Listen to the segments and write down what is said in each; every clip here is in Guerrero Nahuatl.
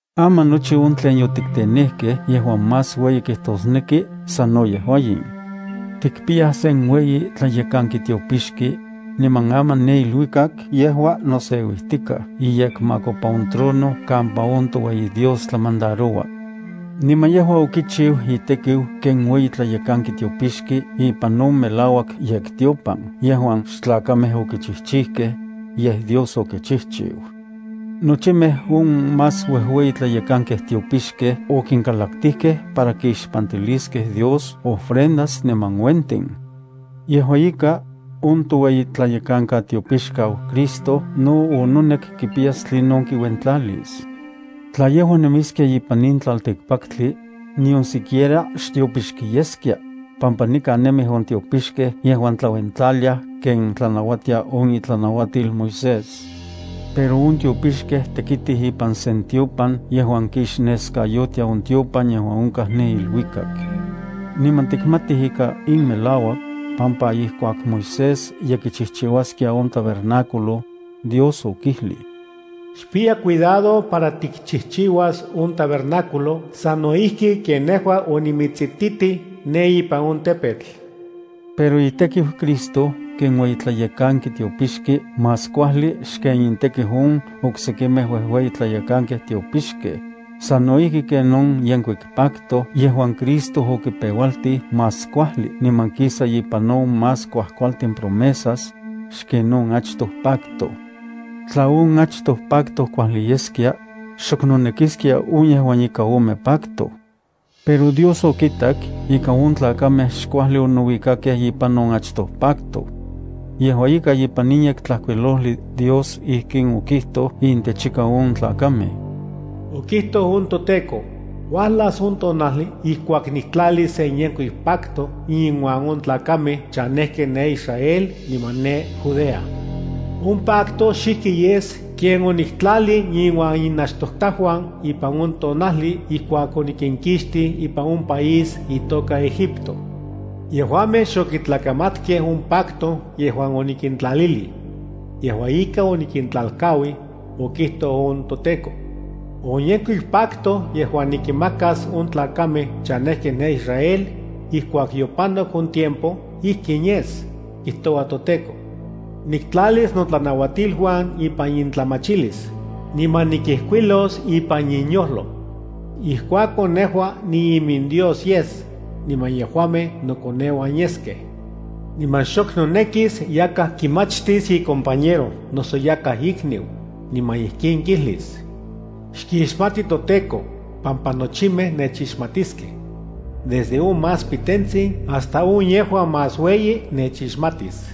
Aman nochi on tlen yotiktenejkej yejuan más ueyi kijtosneki sano yejua in: Tikpiyaj sen ueyi tlayekanki tiopixki, niman aman ne iluikak yejua noseuijtikaj iyekmakopa on trono kampa on toueyi Dios tlamandaroua. Niman yejua kichiu itekiu ken ueyi tlayekanki tiopixki ipan on melauak yektiopan yejuan xtlakamej okichijchijkej, yej Dios okichijchiu. Nochimej on más uejueyi tlayekankej tiopixkej okinkalaktijkej para kixpantiliskej Dios ofrendas niman uentin. Yejua ika, on toueyitlayekankatiopixkau Cristo no ononek kipiyas tlinon kiuentlalis. Tla yejua nemiskia ipan in tlaltikpaktli, nion siquiera xtiopixki yeskia, pampa nikan nemij on tiopixkej yejuan tlauentlaliaj ken tlanauatia on itlanauatil Moisés. Pero on tiopixkej tekitij ipan sen tiopan yejuan kixneskayotia on tiopan yejuan onkaj ne iluikak. Niman tikmatij ika in melauak, pampa ijkuak Moisés ye kichijchiuaskia on tabernáculo, Dios okijlij: “Xpiya cuidado para tikchijchiuas on tabernáculo sano ijki ken nejua onimitsititij ne ipan on tepetl.” Pero itekiu Cristo ken ueyi tlayekanki tiopixki más kuajli xken intekiu on oksekimej uejueyi tlayekankej tiopixkej, sano ijki ken on yenkuik pacto yejuan Cristo okipeualtij más kuajli niman kisa ipan on más kuajkualtin promesas, xken on achtoj pacto. Tla on achtoj pacto kuajli yeskia, xok nonekiskia on yejuan ika ome pacto. Pero Dios okitak ika on tlakamej xkuajli onouikakej ipan on achtoj pacto. Yejua ika ipan in Yektlajkuilojli Dios ijkin okijtoj intech ika on tlakamej: Okijtoj on toTEKO: Uajlas on tonajli ijkuak niktlalis sen yenkuik pacto inuan on tlakamej chanejkej ne Israel niman ne Judea. On pacto xijki yes ken oniktlalij inuan inachtojtajuan ipan on tonajli ijkuak onikinkixtij ipan on país itoka Egipto. Yejuamej xokitlakamatkej on pacto yejuan onikintlalilij. Yejua ika onikintlalkauij, okijtoj on toTEKO. On yenkuik pacto yejuan nikinmakas on tlakamej chanejkej ne Israel, ijkuak yopanok on tiempo ijkin yes, kijtoua toTEKO: Nikintlalis notlanauatiluan ipan intlamachilis, niman nikinmijkuilos ipan inyojlo. Ijkuakon nejua niiminDios yes, niman yejuamej nokoneuan yeskej. Niman xok nonekis yakaj kimachtis icompañero noso yakaj ikniu, niman ijkin kijlis: Xkixmati toTEKO, pampa nochimej nechixmatiskej. Desde on más pitentsin hasta on yejuan más ueyi nechixmatis.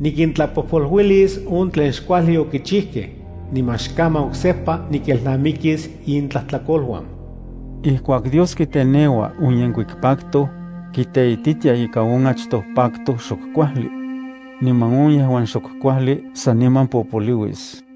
Nikintlapojpoluilis on tlen xkuajli okichijkej, niman xkaman oksejpa nikelnamikis intlajtlakoluan. Ijkuak Dios kiteneua on yenkuik pacto, kiteititia ika on achtoj pacto xok kuajli. Niman on yejuan xok kuajli saniman popolouis.